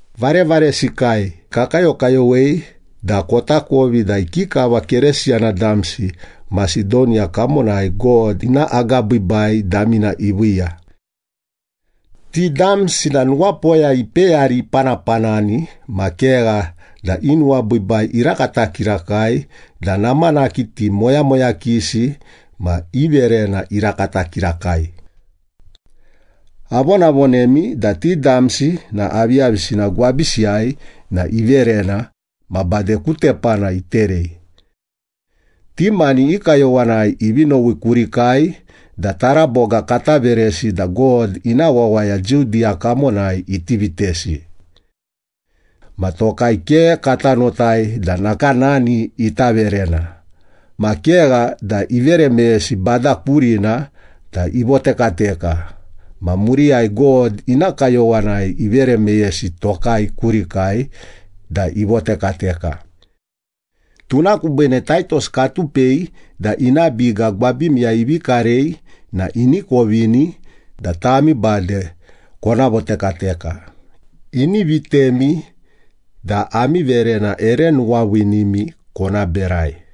Varevaresikai, kakayokayowei da kotakovi da ikikava Keresiyana damsi Masedoniya kamonai God ina agabiibai damina iviiya. Ti damsi na nuwapoya ipeyari ipanapanani, ma kegha da i nuwabiibai irakata kirakai da namanaki ti moyamoyakisi ma i verena irakata kirakai. Avonavonemi da ti damsi na aviyavisina gwabisiyai na iverena, ma bade ku tepana iterei. Ti mani i kayowanai ivi nowi kurikai da taraboga kata veresi da God ina wawaya Judiya kamonai iti vitesi. Ma tokai ke kata notai da nakanani ita verena, ma kegha da ivere meyesi Bada kurina da ivotekateka, ma muriyai God ina kayowanai ivere meyesi tokai kurikai da ivotekateka. Tuna kubiine Taitos katupei da ina biga gwabimiyai ivi karei na ini kovini da tami bade kona votekateka, ini vitemi da ami verena ere nuwaviinimi kona berai.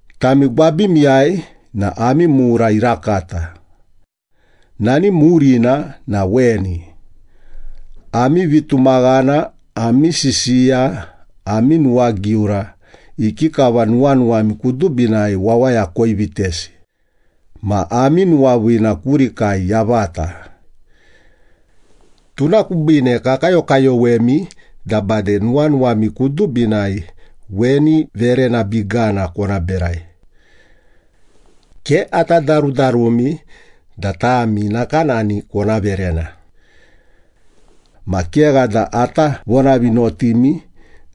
Tami gwabimiyai na ami mura irakata. Nani murina na weni. Ami vitumaghana, ami sisiya, ami nuwagiura, ikikava nuwanuwami kudubinai wawaya koivitesi, ma ami nuwaviina kurikai yavata. Tuna kubiine kakayokayowemi da bade nuwanuwami kudubinai weni verena bigana kona berai. Ke ata darudarumi da tami nakanani kona verena. Ma kegha da ata vonavinotimi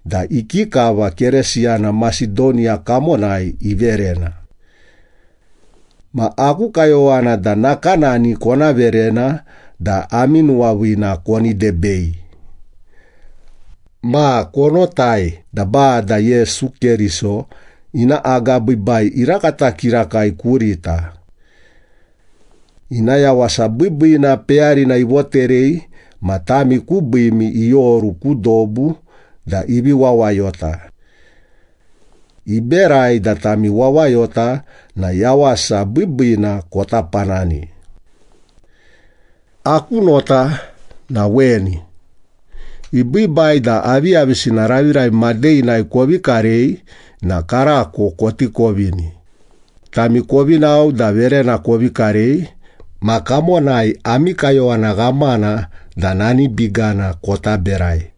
da ikikava Keresiyana Masedoniya kamonai iverena. Ma aku kayowana da nakanani kona verena da ami nuwaviina koni debei. Ma konotai da Bada Yesu Keriso ina agabiibai irakata kirakai kurita. Ina yawasa biibiina peyarina ivoterei ma tami kubiimi ioru ku dobu da ivi wawayota. Iberai da tami wawayota na yawasa biibiina kota panani. Aku nota na weni. Ibiibai da aviyavisina raviravi madeghinai kovi karei na karako koti kovini. Tami kovi nao da verena kovi karei ma kamonai ami kayowana ghamana da nani bigana kota berai.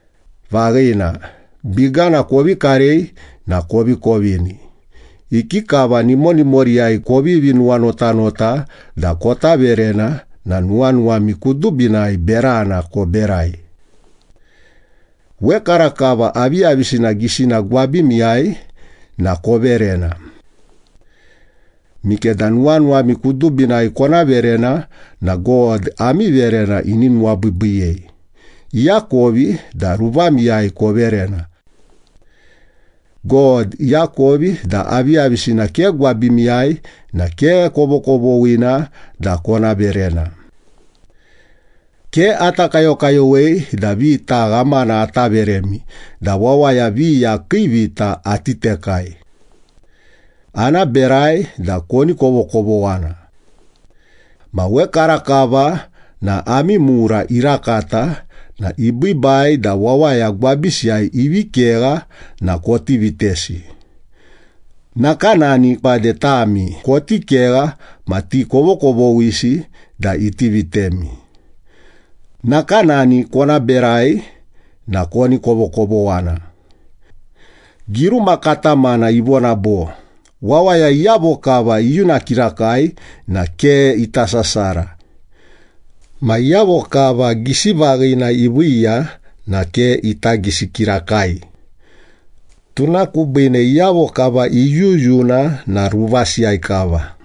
Vaghina, bigana kovi karei na kovi kovini! Ikikava nimonimoriyai kovivi nuwanotanota da kota verena na nuwanuwami kudubinai berana koberai. Wekarakava aviyavisina gisina gwabimiyai na koverena. Mikeda nuwanuwami kudubinai kona verena na God ami verena ini nuwabiibiiyei, iakovi da ruvamiyai koverena. God iakovi da aviyavisina ke gwabimiyai na ke kovokovoghina da kona verena. Ke ata kayokayowei da vita ghamana ata veremi da wawaya viya kii vita ati tekai. Ana berai da koni kovokovoghana. Ma wekarakava na ami mura irakata na ibiibai da wawaya gwabisiyai ivi kegha na koti vitesi. Nakanani bade tami koti kegha ma ti kovokovoghisi da iti vitemi. Nakanani kona berai na koni kovokovoghana. Giruma katamana ivona bo, “Wawaya iyavo kava iyuna kirakai na ke ita sasara. Ma iyavo kava gisivaghina iviiya na ke ita gisi kirakai. Tuna kubiine iyavo kava iyuyuna na ruvasiyai kava.”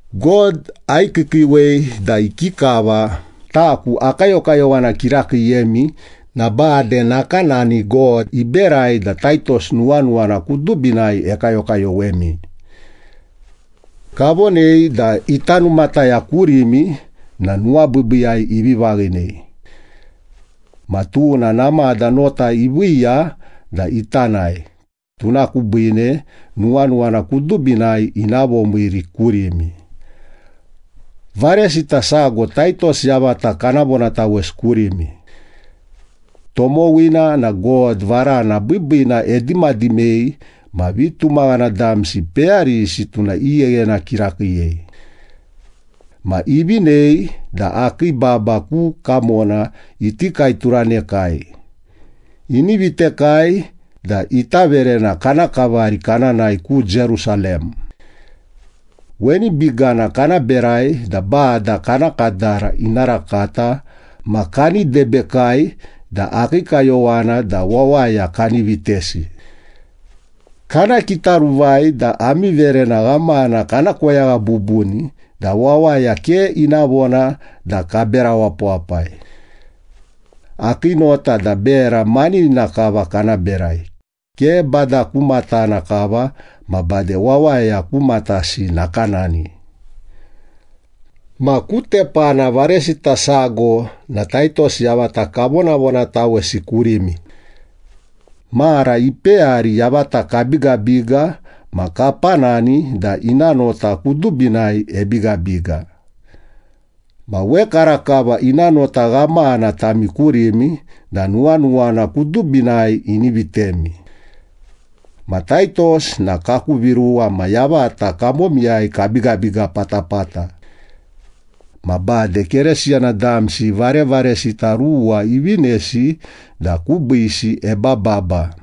God aikiikiiwei da ikikava taku akayokayowana kirakiiyemi na bade nakanani God iberai da Taitos nuwanuwana kudubinai ekayokayowemi. Kavonei da ita numataya kurimi na nuwabiibiiyai ivi vaghinei. Ma tuna namada nota iviiya da ita nae, tuna kubiine nuwanuwana kudubinai ina vomiiri kurimi. Varesita sago Taitos yavata kana vonatawesi kurimi. Tomowina na God varana biibiina edimadimei ma vitumaghana damsi peyarisi tuna igheghena kirakiiyei. Ma ivinei da akii baba ku kamona iti kaeturanekai. Ini vitekai da ita verena kana kavari kana nae ku Jerusalem. Weni bigana kana berai da Bada kana kadara ina rakata ma kani debekai da akii kayowana da wawaya kani vitesi. Kana kitaruvai da ami verena ghamana kana koyagha bubuni da wawaya ke ina vona da kabera wapawapai. Akii nota da bera maninina kava kana berai, ke Bada ku matana kava ma bade wawaya ku matasi nakanani. Ma ku tepana varesita sago na Taitos yavata kavonavonatawei kurimi. Mara ipeyari yavata kabigabiga ma kapanani da ina nota kudubinai ebigabiga. Ma wekarakava ina nota ghamana tami kurimi da nuwanuwana kudubinai ini vitemi. Ma Taitos na kaku viruwa ma yavata kamomiyai kabigabiga patapata. Ma bade Keresiyana damsi varevaresita ruwa ivinesi da kubiisi ebababa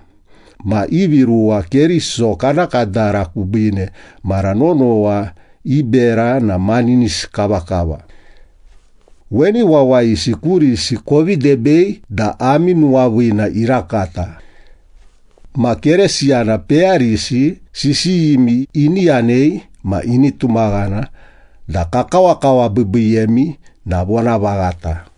ma ivi ruwa Keriso kana kadara kubiine mara nonowa i bera na maninisi kavakava. Weni wawayisi kurisi kovi debei da ami nuwaviina irakata. Ma Keresiyana peyarisi sisiyimi ini yanei ma ini tumaghana da kakawakawabiibiiyemi na vonavaghata.